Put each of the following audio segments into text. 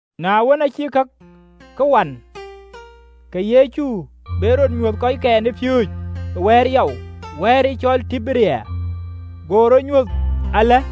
Na wën, aacï kakë wan, ke Yecu be rɔt nyuöth kɔckɛn ë piööcë ë wɛ̈ɛ̈r yɔu, wɛ̈ɛ̈r cɔl Tiberia. Go rɔt nyuɔɔth alë.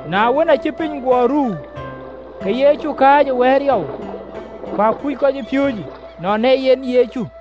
Na wën, aacï piny guɔ ruu, ke Yecu kääc e wɛ̈ɛ̈r yɔu: ku akuc kɔcpiööcë nɔn ee yen Yecu.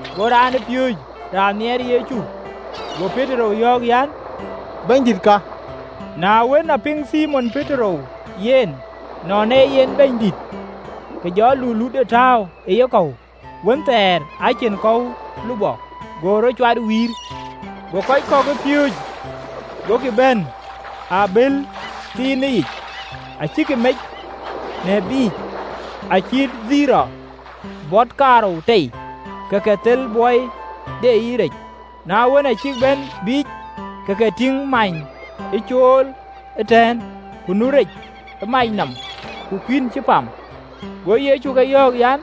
Go raanpiööcë raan nhiɛɛr Yecu go Petero yɔ̈ɔ̈k an, “Bɛ̈nydït ka!” Na wën, a piŋ Thimon Petero yen nɔn ee yen Bɛ̈nydït, ke jɔ alulutde tääu ë yekɔ̈u (wënthɛɛr aa cïn kɔ̈u lupɔ), go rɔt cuat wïïr. Go kɔc kɔ̈k ë piööcë gokï bɛ̈n ë abël thiinë yic (acïkï mec në biic, acït bot kaarou ke akeem tei), ke ke thel bɔi deyic rec. Na wën, aa cïk bɛ̈n, ke ke tïŋ many ë cool ëtɛ̈ɛ̈n, ku nu rɛ̈c ë mac nɔm, ku kuïn cï pam. Go Yecu ke yɔ̈ɔ̈k an,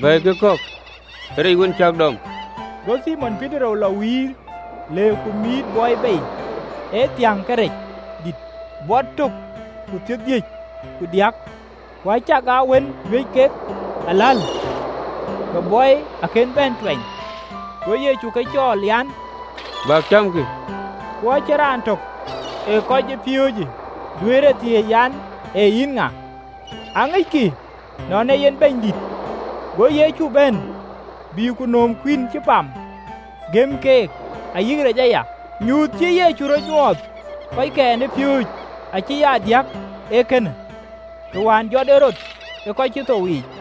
“Bɛ̈ɛ̈ikï rec kɔ̈k wën cäk dɔm.” Go Thimon Petero lɔ wïïr, le ku mïït bɔi bei, ë thiäŋ ke rec dït, bɔt tök ku thiërdhïc ku diäk, ku acakaa wën juëc kek aläl, ke bɔi akën bɛ̈n tuɛny. Go Yecu ke cɔɔl an, “Bäk cämkï.” Ku acïn raan töŋ ë kɔcpiööcë duëër e thiëëc an, “Ee yïn ŋa?” Aŋickï nɔn ee yen Bɛ̈nydït. Go Yecu bɛ̈n, bï ku nööm kuïn cï pam, gɛ̈m keek, ayï rec aya. Nyuöth cïï Yecu rɔt nyuöth kɔckɛn ë piööcë acï aa diäk ee kënë, të wään jɔt en rɔt ë kɔc cï thou yiic.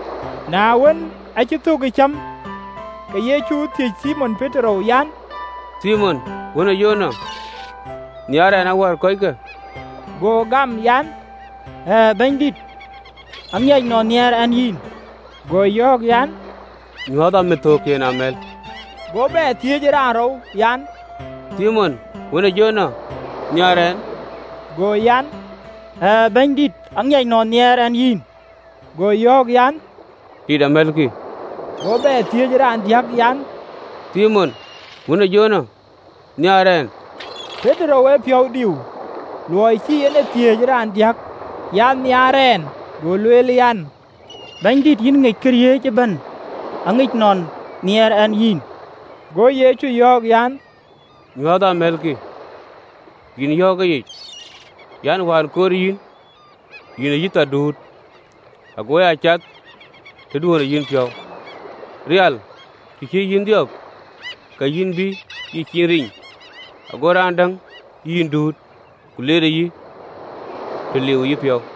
Na wën, aa cïk thök ë cäm, ke Yecu thiëc Thimon Petero an, “Thimon, wën e Jona, nhiaar ɛn awär kɔckë?” Go gam an, “Ɣɛɛ, Bɛ̈nydït, aŋic nɔn nhiaar ɛn yïn.” Go yɔ̈ɔ̈k an, “Nyuääthë amithöökkiën amɛ̈l.” Go bɛ thiëëc raanrou, an, “Thimon, wën ë Jona, nhiaar ɛn?” Go bɛ̈ɛ̈r an, “Ɣɛɛ, Bɛ̈nydït, aŋic nɔn nhiaar ɛn yïn.” Go yɔ̈ɔ̈k an, “Tit amɛ̈lkï.” Go bɛ thiëëc raandiäk an, “Thimon, wën ë Jona, nhiaar ɛn?” Petero piɔ̈u diu luɔi cï en e thiëëc raandiäk an, “Nhiaar ɛn?” Go lueel an, “Bɛ̈nydït, yïn ŋic këriëëc ëbɛ̈n, aŋic nɔn nhiaar ɛn yïn.” Go Yecu yɔ̈ɔ̈k an, “Nyuääthë amɛ̈lkï.” Yïn yɔ̈ɔ̈k ë yic an, “Wään koor yïn, yïn ee yïthar duut, ago aa cath lɔɔr tëduön ë yïnpiɔ̈u: rial, të cï yïn dhiɔp, ka yïn bï yïcin riny, ago raan däŋ yï duut, ku leer yï të liu ë yïpiɔ̈u.”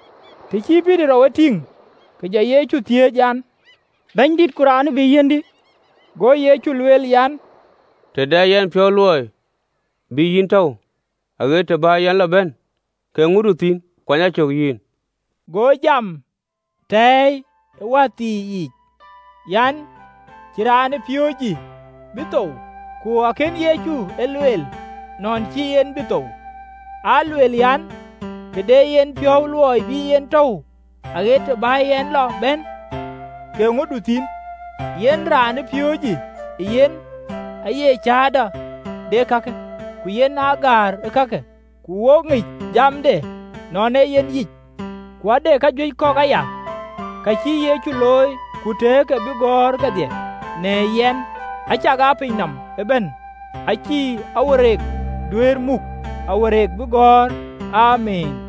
Të cï Petero ye tïŋ, ke jɔ Yecu thiëëc an, “Bɛ̈nydït, ku raanë bï yiɛ̈ndï?” Go Yecu lueel an, “Të dɛ yɛn piɔ̈u luɔi bï en tɔ̈u aɣet të bä yɛn lɔ bɛ̈n, ke eeŋödu thïn? Yïn, kuany a cök!” Go jamë tɛɛi ë wäthii yiic an, cï raanëpiööcëyë bï thou. Ku akënë Yecu e lueel, nɔn cïï en bï thou, aa lueel an, “Të dɛ yɛn piɔ̈u luɔi bï en tɔ̈u aɣet të bä yɛn lɔ bɛ̈n, ke eeŋödu thïn?” Yen raanëpiööcëyë ee yen ee cäätɔ de ee kakë, ku yen aa gäär kakë, ku wo ŋic jamde nɔn ee yen yic. Ku ade kajuëc kɔ̈k aya, ka cïï Yecu looi, ku tëë ke cï gɔ̈ɔ̈r kedhie, në tök tök, acakaa piny nɔm ëbɛ̈n acïï kacïgɔ̈ɔ̈r duëër muk kacïgɔ̈ɔ̈r bïï keek gɔ̈ɔ̈r. Amiin.